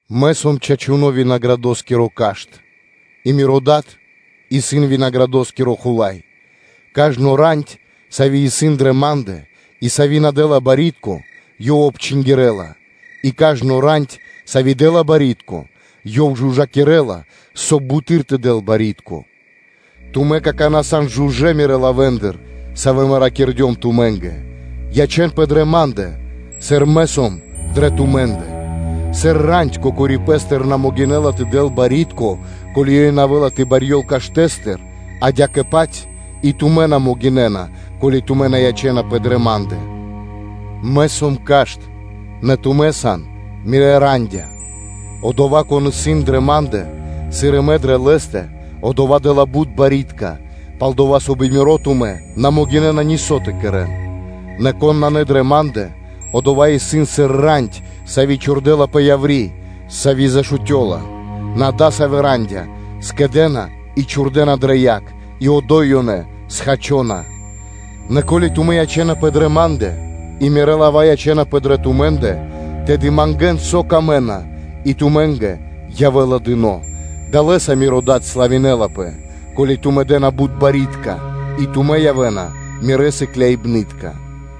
Мэ сом чачуно́ винаградоскиро Кашт (Лоза), и Миро Дад исын винаградникоскиро Хула́й. Кажно рандь (вэтка), сави́ исын дрэ Ма́ндэ, и сави́ на дэ́ла барьякирдо́ (пло́до), Ёв обчингирэла; и кажно рандь, сави́ дэ́ла барьякирдо́, Ёв жужакирэла (чыстинэла), соб (кай) ёй бутэды́р тэ дэл барьякирдо́. Тумэ́ какана́ сан жужэ́ Мирэ́ лавэ́ндыр, савэ́ Мэ ракирдём тумэ́нгэ. Ячэ́нпэ дрэ Ма́ндэ, сыр Мэ сом дрэ тумэ́ндэ. Сыр рандь кокори пэ́стыр на могинэ́ла тэ дэл барьякирдо́, ко́ли ёй на явэ́ла тэ барьёл каштэ́стыр: адя́кэ-паць и тумэ́ на могинэ́на, ко́ли тумэ́ на ячэ́напэ дрэ Ма́ндэ. Мэ сом Кашт, нэ тумэ́ сан Мирэ́ рандя́ (вэ́тки): одова́, кон исын на́ дрэ Ма́ндэ, сыр и Мэ сом дрэ лэ́стэ, одова́ дэ́ла бут барьякирдэ́; пал-дова́ со би Миро тумэ́ на могинэ́на нисо́ тэ кэрэ́н. Нэ, кон на дрэ Ма́ндэ, одова́ исын сыр рандь, сави́ чхурдэлапэ яври́, сави́ зашутёла; нэ адасавэ́ рандя́ скэдэ́на и чхурдэна дрэ яг, и одо́й ёнэ схачона. Нэ ко́ли тумэ́ ячэ́напэ дрэ Ма́ндэ и Мирэ́ лава́ ячэ́напэ дрэ тумэ́ндэ, тэды мангэ́н, со тумэ́нгэ трэй, и тумэ́нгэ явэ́ла дыно́. Далэ́са Миро Дад славинэлапэ, ко́ли тумэ́ дэ́на бут барьякирдэ́, и тумэ́ явэ́на Мирэ́ сыкляибны́тка.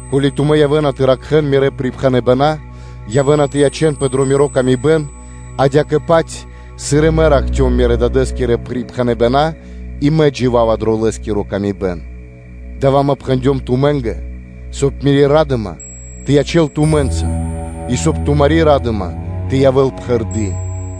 Ко́ли тумэ́ явэ́на тэ ракхэ́н Мирэ́ припхэныбэна́, то тумэ́ явэ́на тэ ячэ́нпэ дро Мири́ ла́ска, адя́кэ-паць, сыр и Мэ ракхцём Мирэ́-Дадэ́скирэ припхэныбэна́, и Мэ джива́ва дро Лэ́скири ла́ска. Дава́ Мэ пхэндём тумэ́нгэ, соб (кай) Мири́ ра́дыма тэ ячэ́л тумэ́нца, и, соб (кай) тумари́ ра́дыма тэ явэ́л пхэрды́.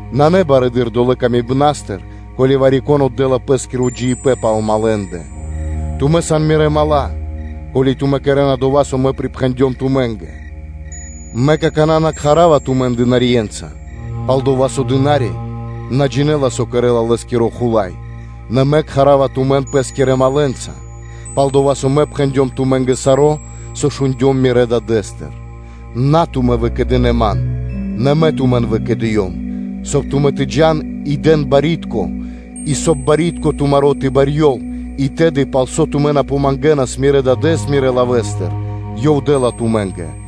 Нанэ барэды́р долэ́ ласкатыр, ко́ли вари-кон отдэ́ла пэ́скиро джиибэ́н пал малэндэ. Тумэ́ сан Мирэ́ дру́ги (мала́), ко́ли тумэ́ кэрэ́на дова́, со Мэ припхэндём тумэ́нгэ. Мэ какана́ на кхара́ва тумэн дынарье́нца, пал-дова́ со дына́ри на джинэ́ла, со кэрэ́ла лэ́скиро хула́й; нэ Мэ кхара́ва тумэн Пэ́скирэ другэнца (малэнца), пал-дова́ со Мэ пхэндём тумэ́нгэ саро́, со шундём Мирэ́ Дадэ́стыр. На тумэ́ выкэдынэ́ Ман, нэ дава́ Мэ тумэн выкэдыём, соб (кай) тумэ́ тэ джа́н и дэн барьякирдо́ и, соб (кай) барьякирдо́ тумаро́ тэ барьёл и тэды, пал со тумэ́ на помангэнас Мирэ́ Дадэ́с Мирэ́ лавэ́стыр, Ёв дэ́ла тумэ́нгэ.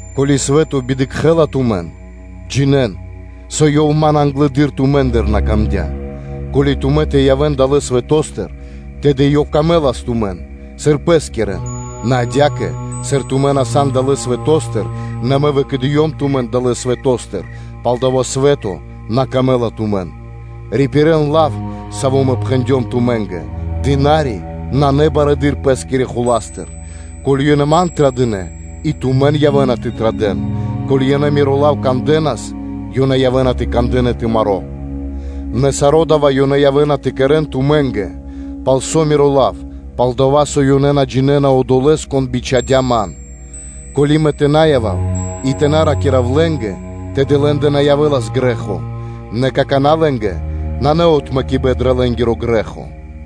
Ко́ли свэ́то на дэ́ла паты́в тумэ́нгэ, джинэ́н, со ёв Ман англэды́р тумэ́ндыр свэ́то на дэ́лас паты́в. Ко́ли тумэ́ тэ явэ́н далэ́ свэто́стыр, тэды лэ́скэ явэ́нас дро́га тумэ́, сыр пэ́скирэ; нэ адя́кэ, сыр тумэ́ на сан далэ́ свэто́стыр, нэ Мэ выкэдыём тумэн далэ́ свэто́стыр, палдава́ тумэ́ сан на дро́га свэтоскэ. Рипирэн лав, саво́ Мэ пхэндём тумэ́нгэ: дына́ри исын на барэды́р пэ́скирэ хуластыр. Ко́ли ёнэ Ман традынэ, и тумэн явэ́на тэ традэ́н; ко́ли ёнэ Миро лав кандэнас, ёнэ явэ́на тэ кандэ́н и тумаро́ лав. Нэ саро́ дава́ ёнэ явэ́на тэ кэрэ́н тумэ́нгэ пал Миро лав, пал-дова́ со ёнэ на джинэ́на Одолэ́с, Кон бичхадя́ Ман. Ко́ли Мэ тэ на явав и тэ на ракира́в лэ́нгэ, тэды лэ́ндэ на явэ́лас грэ́хо; нэ какана́ лэ́нгэ нанэ отмэкибэн дрэ лэ́нгиро грэ́хо.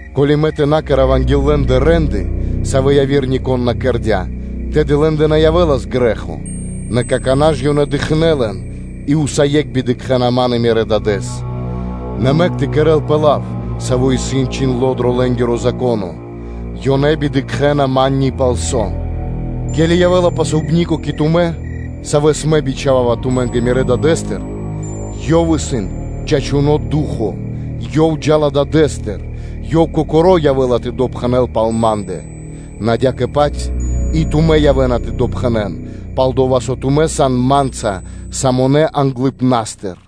Ко́ли Мэ тэ на кэра́в анги́л лэ́ндэ рэ́нды, савэ́ яви́р нико́н на кэрдя́, тэды лэ́ндэ на явэ́лас грэ́хо; нэ какана́ ж ёнэ дыкхнэ́ лэн и усае́кх бидыкхэна (на дэ́на паты́в) Ман и Мирэ́ Дадэ́с. Нэ мэк тэ кэрэ́лпэ лав, саво́ исын чхиндло́ дро лэ́нгиро Зако́но: ‘Ёнэ бидыкхэна Ман ни палсо́’. Ке́ли явэ́ла Обрадыпнаскиро (Утешытеле) кэ тумэ́, савэ́с Мэ бичхава́ва тумэ́нгэ Мирэ́ Дадэ́стыр, ёв исын чачуно́ Ду́хо (Фа́но), Ёв джа́ла Дадэ́стыр, Ёв Кокоро́ явэ́ла тэ допхэнэл пал Ма́ндэ. Нэ адя́кэ-паць и тумэ́ явэ́на тэ допхэнэн, пал-дова́ со тумэ́ са́нас Ма́нца самонэ англыпна́стыр.